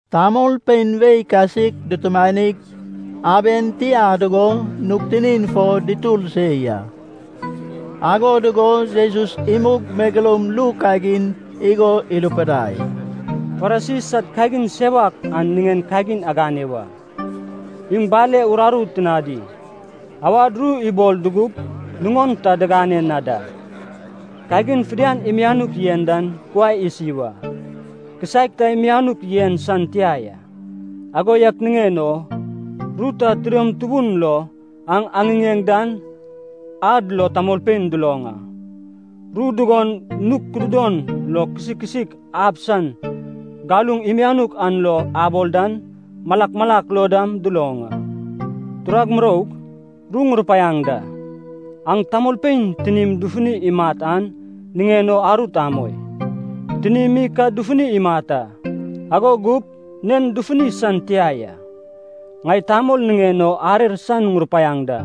Tamolpein wei kasik dutumanig, aben tia dugo nug tinin fo dutur se ya. Ago dugo Jesus imug megeloum ru kagin igo irupidai, “Farisi sad kagin sewak an niŋen kagin agane wa. Iŋ bale uraru tinadi, awad ru ibol dugup nuŋon ta digane na da. Kagin fidian imianuk yen dan kuai isi wa. Kisaek ta imianuk yen san tia ya. Ago yak niŋen o ru ta tidom tubun lo aŋ aŋiŋeŋ dan ad lo tamolpein duloŋ a. Ru dugon nug kududon lo kisikisik ab san galuŋ imianuk an lo abol dan, malak malak lo dam duloŋ a. “Turag muroug, ru ŋurupaiaŋ da. Aŋ tamolpein tinim dufuni imat an niŋen o arut amoi. Tinim mi ka dufuni imat a, ago gup nen dufuni san tia ya. Ŋai tamol niŋen o arer san ŋurupaiaŋ da.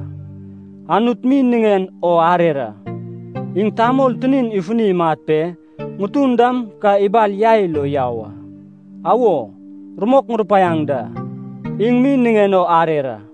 Anut mi niŋen o arer a. Iŋ tamol tinin ifuni imat pe ŋutun dam ka ibal yai lo yau a. Awo, rumok ŋurupaiaŋ da, iŋ mi niŋen o arer a!”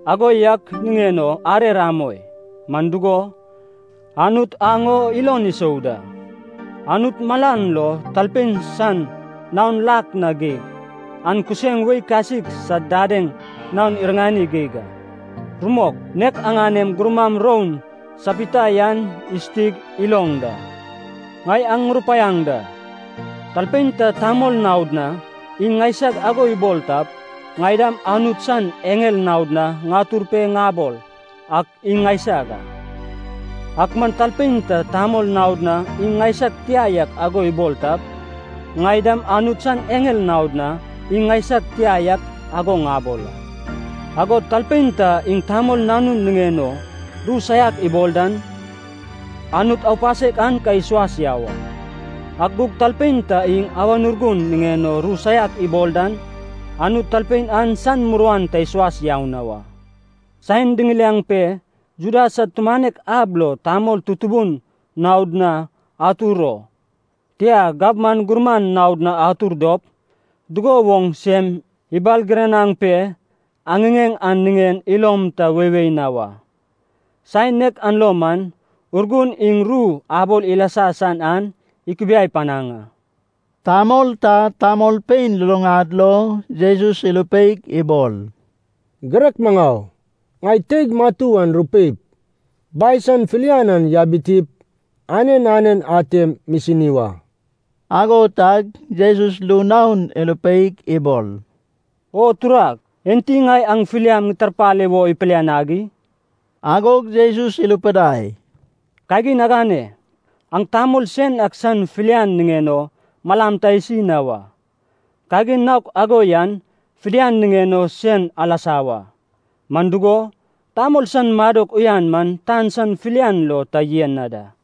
Ago yak niŋen o arer amoi. Man dugo, Anut aŋ o ilon isou da. Anut malan lo talpein san naon lak na geig, an kuseŋ wei kasik sad dadeŋ naon iriŋani geig a. Rumok, nek aŋanem gurmam roun sapita yan isutig iloŋ da.” “Ŋai aŋ ŋurupaiaŋ da. Talpein ta tamol naod na iŋ ŋaisag ago ibol tap, ŋai dam Anut san eŋel naod na ŋatur pe ŋabol ak iŋ ŋaisag a. Ak man talpein ta tamol naod na iŋ ŋaisag tia yak ago ibol tap, ŋai dam Anut san eŋel naod na iŋ ŋaisag tia yak ago ŋabol a. Agod talpein ta iŋ Tamol Nanun niŋen o ru saiak ibol dan, Anut aupasek an ka isuas yau a. Ak gug talpein ta iŋ Awan Urgun niŋen o ru saiak ibol dan, Anut talpein an san muruan ta isuas yau na wa.” “Saen diŋiliaŋ pe Juda sad tumanek ab lo tamol tutubun naod na atur o, tia gabman gurman naod na atur dop, dugo woŋ sem ibalgiranaŋ pe aŋiŋeŋ an niŋen ilom ta weiwei na wa. Saen nek an lo man Urgun iŋ ru abol ilasa san an ikubiai panaŋ a.” Tamol ta tamolpein luluŋad lo Jesus irupeig ibol, “Girek maŋau, ŋai teig matu an rupeip, bai san filian an yabitip, anen anen atem misini wa.” Ago tag Jesus ru naon irupeig ibol, “O turag, enti ŋai aŋ filiam ŋitarpale wo ipilianag i?” Agog Jesus irupidai, “Kagin agane. Aŋ tamol sen ak san filian niŋen o malam ta isi na wa, kagin naok ago yan fidian niŋen o sen alasa wa. Man dugo, tamol san madok uyan man tan san filian lo ta yen na da.”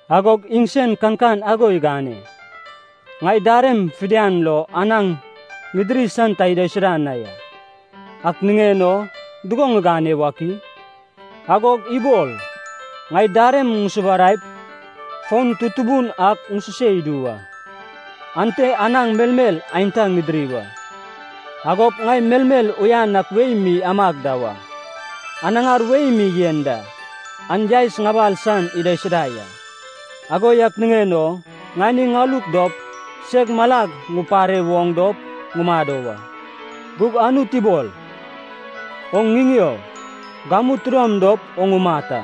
Agog iŋsen kankan ago igane, ‘Ŋai darem fidian lo anaŋ ŋidiri san ta idaisuda na ya. Ak niŋen o dugo ŋigane wak i?’ Agog ibol, ‘Ŋai darem ŋusubaraip, foun tutubun ak ŋususe idu wa. Ante anaŋ, melmel aenta ŋidiri wa. Agop ŋai melmel uyan ak wei mi amag da wa. Anaŋar wei mi yen da, an yaes ŋabal san idaisuda ya. Ago yak niŋen o ŋani ŋaluk dop, seg malag ŋupare woŋ dop ŋumado wa.’” “Gug Anut ibol, ‘Oŋ ŋiŋeo! Gamu tidom dop oŋ umat a.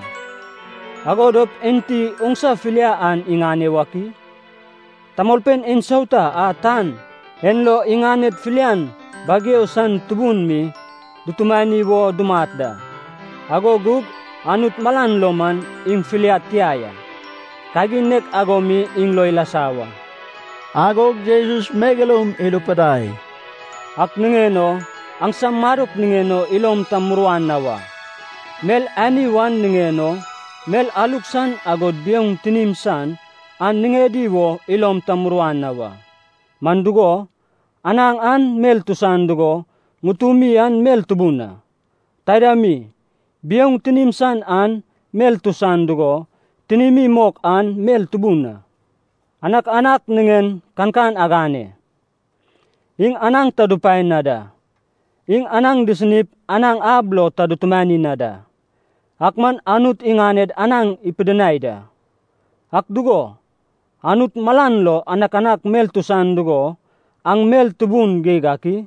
Ago dop enti oŋsa filia an iŋane wak i?’” “Tamolpein ensauta a tan en lo iŋaned filian bageu san tubun mi dutumani wo dumat da, ago gug Anut malan lo man iŋ filiad tia ya, kagin nek ago mi iŋ lo ilasa wa.” Agog Jesus megeloum irupidai, “Ak niŋen o aŋsam madok niŋen o ilom ta muruan na wa. Mel ani wan niŋen o, mel aluk san agod biouŋ tinim san an niŋedi wo ilom ta muruan na wa. Man dugo, anaŋ an mel tusan dugo ŋutumi an mel tubun a. Taida mi, biouŋ tinim san an mel tusan dugo tinimi mok an mel tubun a. Anakanak niŋen kankan agane, iŋ anaŋ ta dupae na da, iŋ anaŋ disinip anaŋ ab lo ta dutumani na da, ak man Anut iŋaned anaŋ ipidinai da. Ak dugo, Anut malan lo anakanak mel tusan dugo aŋ mel tubun geig ak i?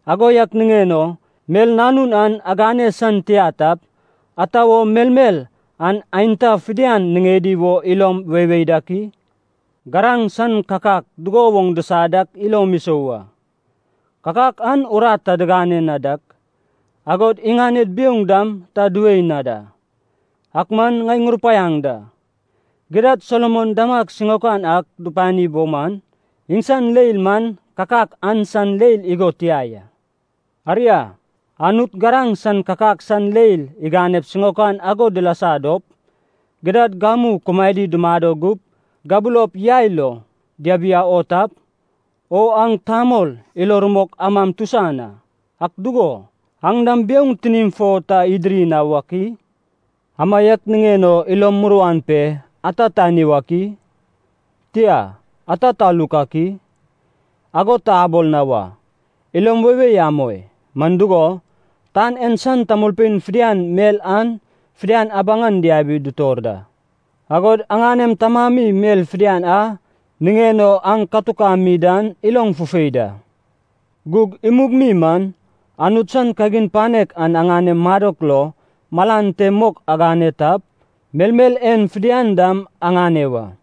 Ago yak niŋen o mel nanun an agane san tia tap, ata wo melmel an aenta fidian niŋedi wo ilom weiwei dak i? “Garaŋ san kakak dugo woŋ disa dak ilom isou a. Kakak an urat ta digane na dak, agod iŋaned biouŋ dam ta diwei na da. Ak man ŋai ŋurupaiaŋ da, gidad Solomon damag siŋaokan ak dupani bo man, iŋsan leil man kakak an san leil igo tia ya. Aria, Anut garaŋ san kakak san leil iganep siŋaokan ago dilasa dop, gidad gamu kumaedi dumado gup gabulop yai lo diabiau o tap, o aŋ tamol ilo rumok amam tusan a, ak dugo, aŋ dam biouŋ tinim fo ta idiri na wak i? Amaiak niŋen o ilom muruan pe ‘ata tani wak i?’ tia, ‘ata taluk ak i?’ ago ta abol na wa. Ilom weiwei amoi. Man dugo, tan en san tamolpein fidian mel an fidian abaŋan diabi dutor da. Agod aŋanem Tamami mel fidian a niŋen o aŋ katukami dan iloŋ fufei da. Gug imug mi man, Anut san kagin panek an aŋanem madok lo malan te mok agane tap, melmel en fidian dam aŋane wa.”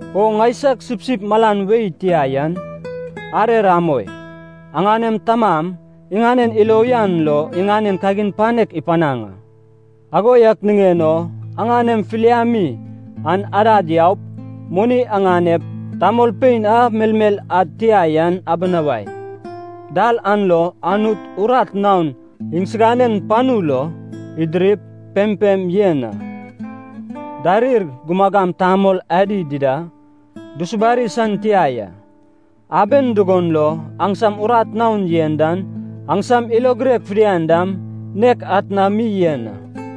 “O ŋaisag sipsip malan wei tia yan, arer amoi. Aŋanem Tamam iŋanen ilo uyan lo iŋanen kagin panek ipanaŋ a. Ago yak niŋen o aŋanem filiami an adad yaup, moni aŋanep, tamolpein a melmel ad tia yan abinawai. Dal an lo Anut urat naon iŋsiganen panu lo idirip, pempem yen a. Darir, gumagam tamol adi dida dusubari san tia ya. Aben dugon lo aŋsam urat naon yen dan aŋsam ilo girek fidian dam nek atna mi yen a.”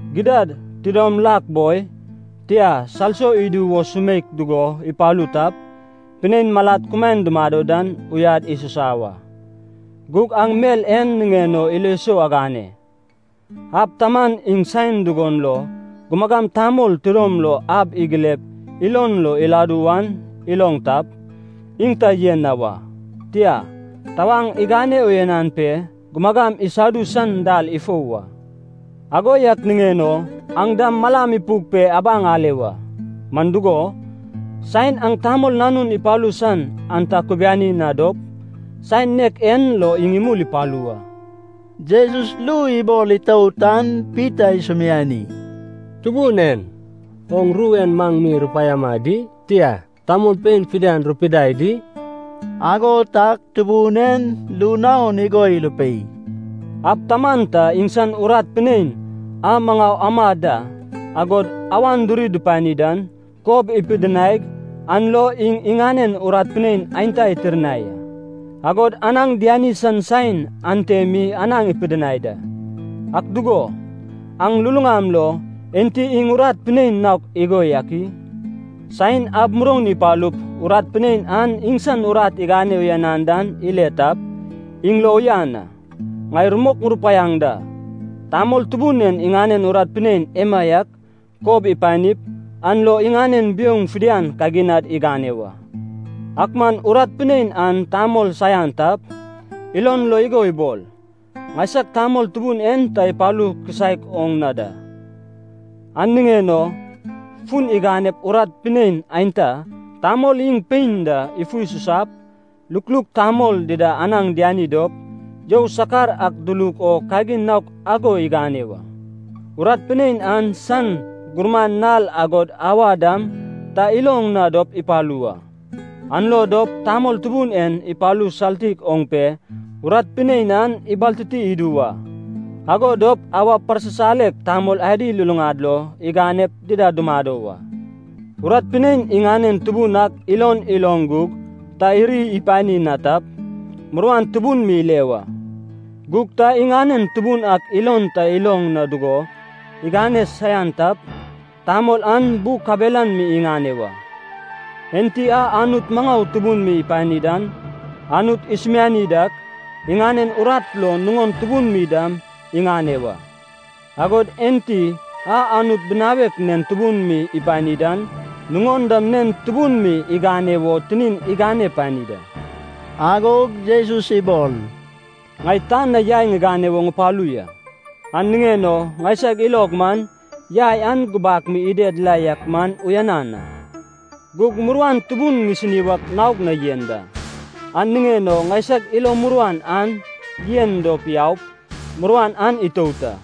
Gidad, tidom lak boi, tia, salso idu wo sumeik dugo ipalu tap, pinein malad kumaen dumado dan uyad isusa wa. Gug aŋ mel en niŋen o ilo sou agane. Ab taman iŋ saen dugon lo gumagam tamol tidom lo ab igilep ilon lo iladu wan iloŋ tap, iŋ ta yen na wa. Tia, tawaŋ igane uyanan pe gumagam isadu san dal ifou wa. Ago yak niŋen o aŋ dam malam ipuk pe abaŋ ale wa. Man dugo, saen aŋ Tamol Nanun ipalu san an ta akubiani na dop, saen nek en lo iŋ imul ipalu wa.” Jesus ru ibol itout an Pita isumiani, “Tubun en. Oŋ ru en maŋ mi rupaiama di? Tia, tamolpein fidian rupidai di?” Ago tag Tubun en ru naon igo irupei, “Ab taman ta iŋsan urat pinein a maŋau amad da, agod awan diri dupani dan, kob ipidinaig an lo iŋ iŋanen urat pinein aenta itirnai a, agod anaŋ diani san saen ante mi anaŋ ipidinai da. Ak dugo, aŋ luluŋam lo, enti iŋ urat pinein naok igo yak i? Saen ab muroun ipalup urat pinein an iŋsan urat igane uyanan dan ile tap, iŋ lo uyan a. Ŋai rumok ŋurupaiaŋ da. Tamol tubun en iŋanen urat pinein emaiak kob ipanip, an lo iŋanen biouŋ fidian kaginad igane wa. Ak man urat pinein an tamol saian tap, ilon lo igo ibol, ‘Ŋaisag tamol tubun en ta ipalu kisaek oŋ na da.’ An niŋen o fun iganep urat pinein aenta, tamol iŋ pein da, ifu isusap, lukluk tamol dida anaŋ diani dop, you sakar ak duluk o kagin naok ago igane wa. Urat pinein an san gurman nal agod auwa dam ta iloŋ na dop ipalu wa. An lo dop tamol tubun en ipalu saltik oŋ pe urat pinein an ibaltiti idu wa. Ago dop awa parsisalek tamol adi luluŋad lo iganep dida dumado wa.” “Urat pinein iŋanen tubun ak ilon iloŋ gug ta iri ipani na tap, muruan tubun mi ile wa. Gug ta iŋanen tubun ak ilon ta iloŋ na dugo igane saian tap, tamol an bu kabelan mi iŋane wa. Enti a Anut maŋau tubun mi ipani dan, Anut isumiani dak, iŋanen urat lo nuŋon tubun mi dam igane wa. Agod enti a Anut binawek nen tubun mi ipani dan, nuŋon dam nen tubun mi igane wo tinin igane pani da.” Agog Jesus ibol, “Ŋai tan na yai ŋigane wo ŋupalu ya. An niŋen o ŋaisag ilog man yai an gubak mi ided la yak man uyanan a. Gug muruan tubun ŋisini wak naog na yen da. An niŋen o ŋaisag ilo muruan an yen dop yaup, muruan an itout a.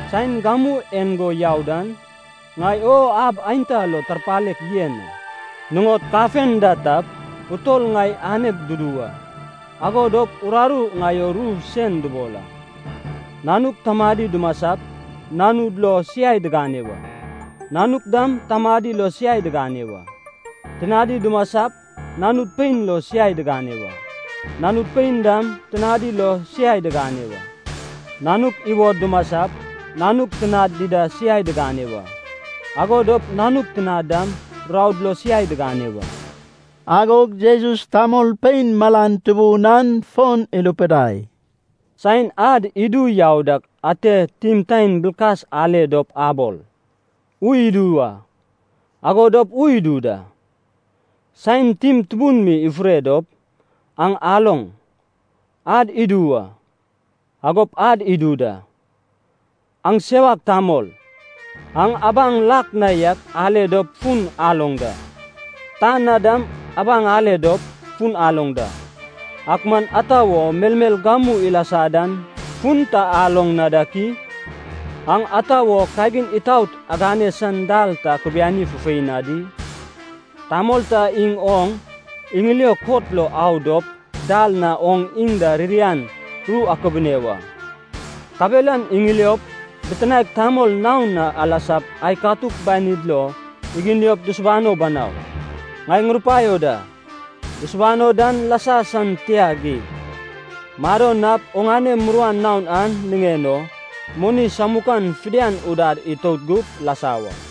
Saen gamu en go yau dan, ŋai o ab aenta lo tarpalek yen a. Nuŋod kafenda tap, utol ŋai aneg dudu wa, ago dop uraru ŋai o ru sen dubol a. Nanuk tamadi dumasap, nanud lo siai digane wa. Nanuk dam tamadi lo siai digane wa. Tinadi dumasap, nanud pein lo siai digane wa. Nanud pein dam tinadi lo siai digane wa. Nanuk iwod dumasap, nanuk tinad dida siai digane wa. Ago dop nanuk tinad dam raod lo siai digane wa.” Agog Jesus tamolpein malan tubun an fon irupidai, “Saen ad idu yau dak ate timtaen bilkas ale dop abol da, ‘Ui idu wa.’ Ago dop ui idu da. Saen tim tubun mi ifure dop, aŋ aloŋ, ad idu wa. Agop ad idu da. Aŋ sewak tamol. Aŋ abaŋ lak na yak ale dop fun aloŋ da. Tan na dam abaŋ ale dop, fun aloŋ da. Ak man ata wo melmel gamu ilasa dan fun ta aloŋ na dak i?” “Aŋ ata wo kagin itaot agane san dal ta akubiani fufei na di? Tamol ta iŋ oŋ iŋilio kot lo au dop dal na oŋ iŋ da ririan ru akubune wa. Kabelan iŋiliop, bitinaek tamol naon na alasap ai katuk banid lo iginiop dusubano banau. Ŋai ŋurupaio da. Dusubano dan lasa san tia geig. Mado nap oŋane muruan naon an niŋen o, moni samukan fidian udad itout gup, lasa wa.”